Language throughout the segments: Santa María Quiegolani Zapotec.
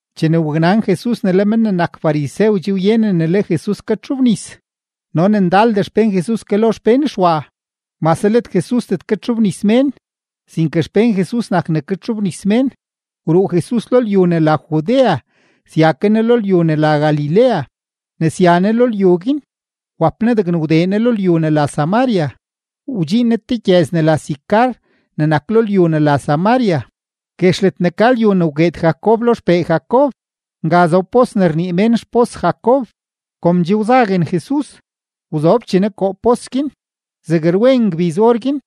Chene waknan Jesus ne le men ne nak farisew che wyenen ne le Jesus katxobnis no ne ndaldee xpén Jesus ke lo xpén Xwa, (mase let Jesusdet katxobnis mén, sinke xpén Jesus nak ne katxobnis mén.) wruu Jesus lo lyu ne la Judea sya ke Ne lo lyu ne la Galilea. Ne sya Ne lo lyu guin, wap Ne degne wdee Ne lo lyu ne la Samaria. Wdxiin Ne te gyëz ne la Sicar ne nak lo lyu ne la Samaria, guex ledne ka lyu ne wgueed Jacob lo Xeb xpee Jacob. Nga zob pos ne rnii mén xpos Jacob, kom che wzaguen Jesus, wzobchee Ne koo pos guin, zeg rwen ngbiz orguin.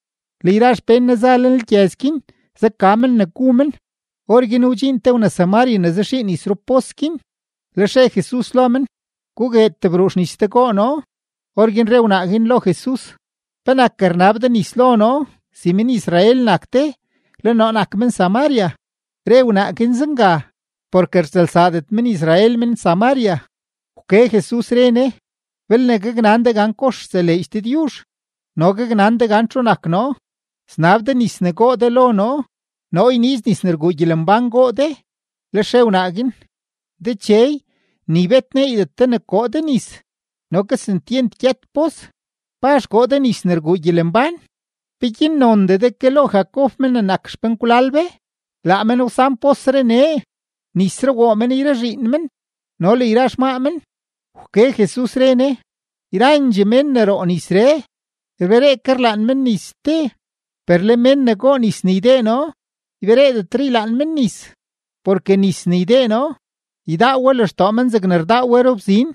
Le yra xpén Ne za lenlgyëz guin zaka men ne gu men. Orguin wdxiin te wna-Samaria ne zaxii nis rupos guin, lex re Jesus lo men: ―Gugued tebruu xnis de goo noo. Orguin re wnaa guin lo Jesus: ―¿Penak rnab de nis lo noo si men-Israel nak de, le noo nak men-Samaria? (Re wnaa guin zenga, porke rtsëlsaadet men-Israel men-Samaria.) Wke Jesus, re Ne: ―Belne gaknan de gan kox rseleedx Dëdyuzh no gaknan de gan txu nak noo, snab de nis ne goo de lo noo, noo yniiz nis ne rguu gyelembán goo de. Lex re wnaa guin: ―Dechey, ni bet neeydet de ne koo de nis no kesentyent gyët pos. ¿Pazh koo de nis ne rguu gyelembán? ¿Peguin nondee de ke lo Jacob men ne nak xpenkwlal be? Laa men wsan posree nee, nisree woo men yra zhiin men no le yra xmaa men. Wke Jesus, re Ne: ―Yrandxee mén ne roo nisree, rberee ke rlaan men nis ste; per le mén ne goo nis ne ydee noo, ybereedetre ylaan men nis. Porke nis ne ydee noo, ydaa we lextoo men zegne rdaa we rubzin,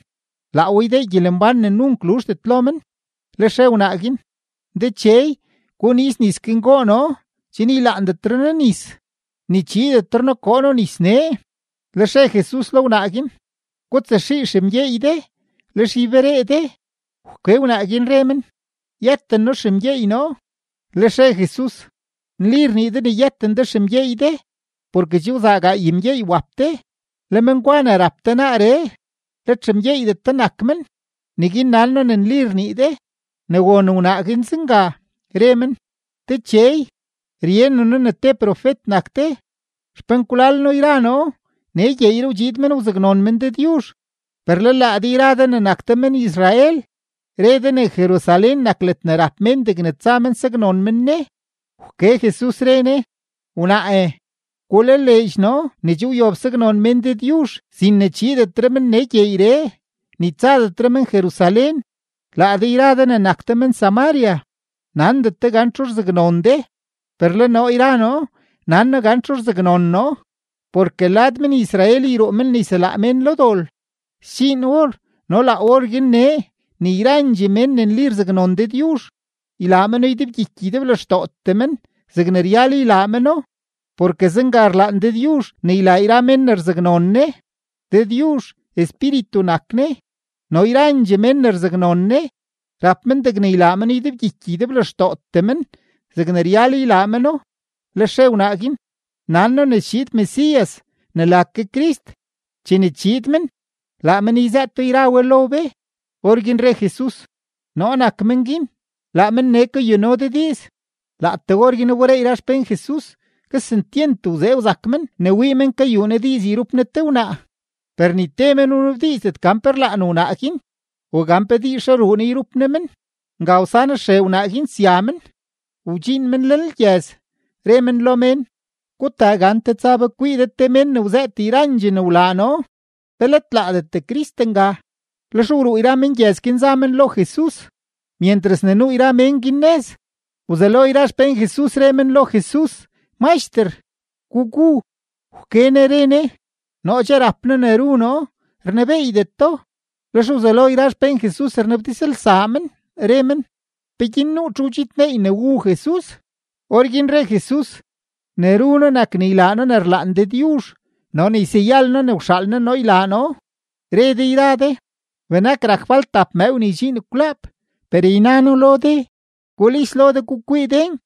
laa we ydee gyelembán ne nunk luzhdet lo men. Lex re wnaa guin: ―Dechey, guniiz nis guin goo noo chen ylaandetre noo nis, ni chiidetre noo koo noo nis nee. Lex re Jesus lo wnaa guin: ―Gutsaxii xemgyeey de, lex yberee de. Wke wnaa guin, re men: ―Yëten noo xemgyeey noo. Lex re Jesus: ―Nli rnii de ne yëten de xemgyeey de. Porke che wzaa gaay mgyeey wap de, le men gwa ne rap de naaree, let xemgyeeydet de nak men; neguin nan noo ne nli rnii de. Ne won wnaa guin zenga, re men: ―Dechey, ryenen noo ne te profet nak de. Xpenkwlal noo yra noo nee gyeeyree wdxiid men wzaknon men Dëdyuzh, per le laa de yra de ne nak de men-Israel, re de ne Jerusalén nak ledne rap mén degne tsa men saknon men Ne. Wke Jesus, re Ne: ―Wnaae, gulaleedx noo ne che wyob saknon mén Dëdyuzh sin ne chiidetre men nee gyeeyree, ni tsadetre men Jerusalén. Laa de yra de ne nak de men-Samaria, nandet de gan txu rzaknon de, per le noo yra noo nan noo gan txu rzaknon noo; porke lad men-Israel yruu men ne yselaa mén lo dol. Sdxiin or no laa orguin nee ne yrandxee mén ne nli rzaknon Dëdyuzh, ylaa meno ydebgyiky ydeblextootee men zegne ryal ylaa meno. Porke zenga rlaan Dëdyuzh ne ylaa yra mén ne rzaknon Ne. Dëdyuzh Espíritu nak Ne, no yrandxee mén ne rzaknon Ne, rap men degne ylaa meno ydebgyiky ydeblextootee men zegne ryal ylaa meno. Lex re wnaa guin: ―Nan noo ne schiid Mesías ne la ke Crist; chene chiid men, laa men yzëëto yra we lo be. Orguin re Jesus: ―Noo nak men guin, laa men nee kayuno de diiz. Laatee orguin wberee yra xpén Jesus, kesentyent wzee wzak men ne wii men kayuu Ne diiz yrup Ne te wnaa; per ni te men wnabdiizdet gan pe rlaan wnaa guin o gan pe diizzhe ruu Ne yrup Ne men. Nga wsan xree wnaa guin sya men. Wdxiin men lenlgyëz, re men lo mén: ―Gutaa gante, tsa be kwii de te mén ne wzëët yrandxee ne wlaa noo. ¿Pe let laadet Crist nga? Lex wruu yra mén gyëz guin za men lo Jesus. Myentras ne nuu yra mén guin nëz, wzelo yra xpén Jesus re men lo Jesus: ―Maxter, gugu. Wke Ne re Ne: ―Noo che rap noo ne ru noo, rnebeeydet do. Lex wzelo yra xpén Jesus rnabdizlsaa men, re men: ―¿Peguin nuu txu wdxidneey ne wu Jesus? Orguin re Jesus: ―Ne ru noo nak ne ylaa noo ne rlaan Dëdyuzh no ne yseyal noo ne wxaal Ne noo ylaa noo. Re de yra de: “Benak rak falt tap mëëw ne ydxiin kwlaap.” Per yna noo lo de: Gulis lo de gukwii den,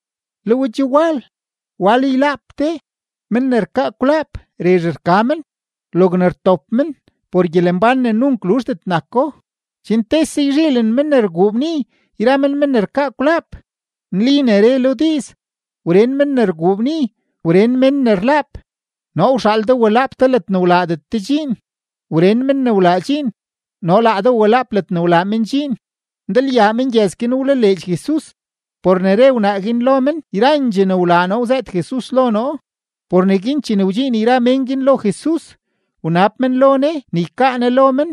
le we che wal, wal ylaap de. Men ne rkaa kwlaap rezh rka men; logne rtop men por gyelembán ne nunk luzhdet nako, chen tese yzhiilen men ne rguu bni yra men men ne rkaa kwlaap. Nli ne re lo diiz: “Wren mén ne rguu bni, wren mén ne rlaap.” Noo wxaal de walaap de ledne wlaadet de dxiin; wren mén ne wlaa dxiin no laa de walaap ledne wlaa men dxiin. Ndalyaa mengyëz guin wlaleedx Jesus por ne re wnaa guin lo men: “Yrandxee ne wlaa noo wzëët Jesus lo noo.” Por neguin chene wdxiin yra mén guin lo Jesus, wnab men lo Ne ne ykaa Ne lo men.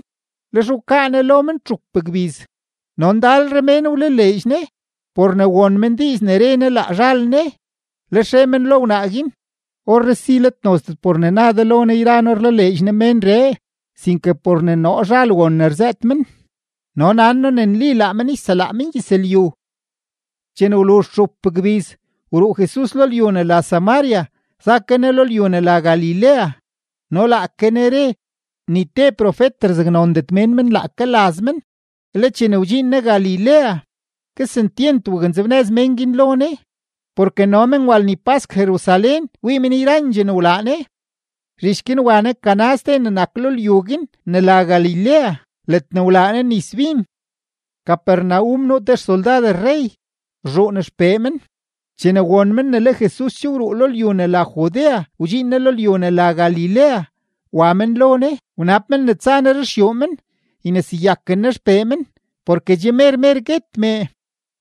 Lex wkaa Ne lo men txup gbiz, no ndalre mén wlaleedx Ne por ne won men diiz ne re Ne laa zhal Ne. Lex re men lo wnaa guin: ―Orree si let nozdet por ne na de lo noo yra noo rlaleedx noo ménree, sinke por ne noo zhal won ne rzëët men, no nan noo ne nli laa men yselaa mengyëzlyu. Chene wluzh txup gbiz, wruu Jesus lo lyu ne la Samaria za ke Ne lo lyu ne la Galilea. No laake Ne re, ni te profet rzaknondet mén men laake laz men. Le chene wdxiin Ne Galilea, kesentyent waknzebnëz mén guin lo Ne porke no men wa lni pask Jerusalén wii men yrandxee ne wlaa Ne. Zhich guin wa Ne Caná ste ne nak lo lyu guin ne la Galilea, ledne wlaa Ne nis bin. Capernaum nuu te xsoldad rrey, rzhuun xpee men. Chene won men ne le Jesus che wruu lo lyu ne la Judea wdxiin Ne lo lyu ne la Galilea, wa men lo Ne wanab men ne tsa Ne ruxyuu men yneseyaken Ne xpee men porke che mer mer guet mee.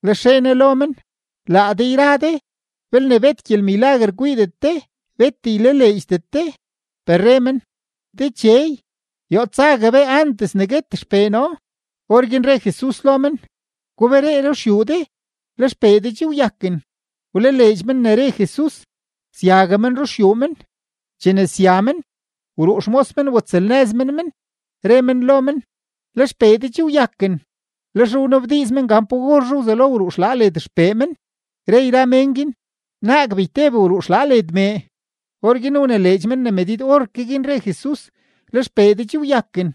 Lex re Ne lo men: ―Laa de yra de belne bet gyelmilaguer kwiidet de, bet ylaleedxdet de. Per re men: ―Dechey, yoo tsague be antes ke ne guet xpee noo. Orguin re Jesus lo men: ―Guberee ruxyuu de, le xpee de che wyaken. Wlaleedx men ne re Jesus, syague men ruxyuu men. Chene sya men, wruu xmos men watsëlnëz men men, re men lo men: ―Le xpee de che wyaken. Lex wnabdiiz men gan pa orzhe wzelo wruu xlaa led xpee men, re yra mén guin: ―Naag beyteb wruu xlaa led mee. Orguin wnileedx men ne medid orke guin re Jesus: “Le xpee de che wyaken.”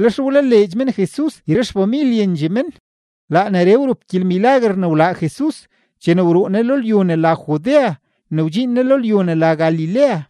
Lex wlaleedx men Jesus yra xfamilyendxee men. Laa neree wrup gyelmilaguer ne wlaa Jesus chene wruu Ne lo lyu ne la Judea ne wdxiin Ne lo lyu ne la Galilea.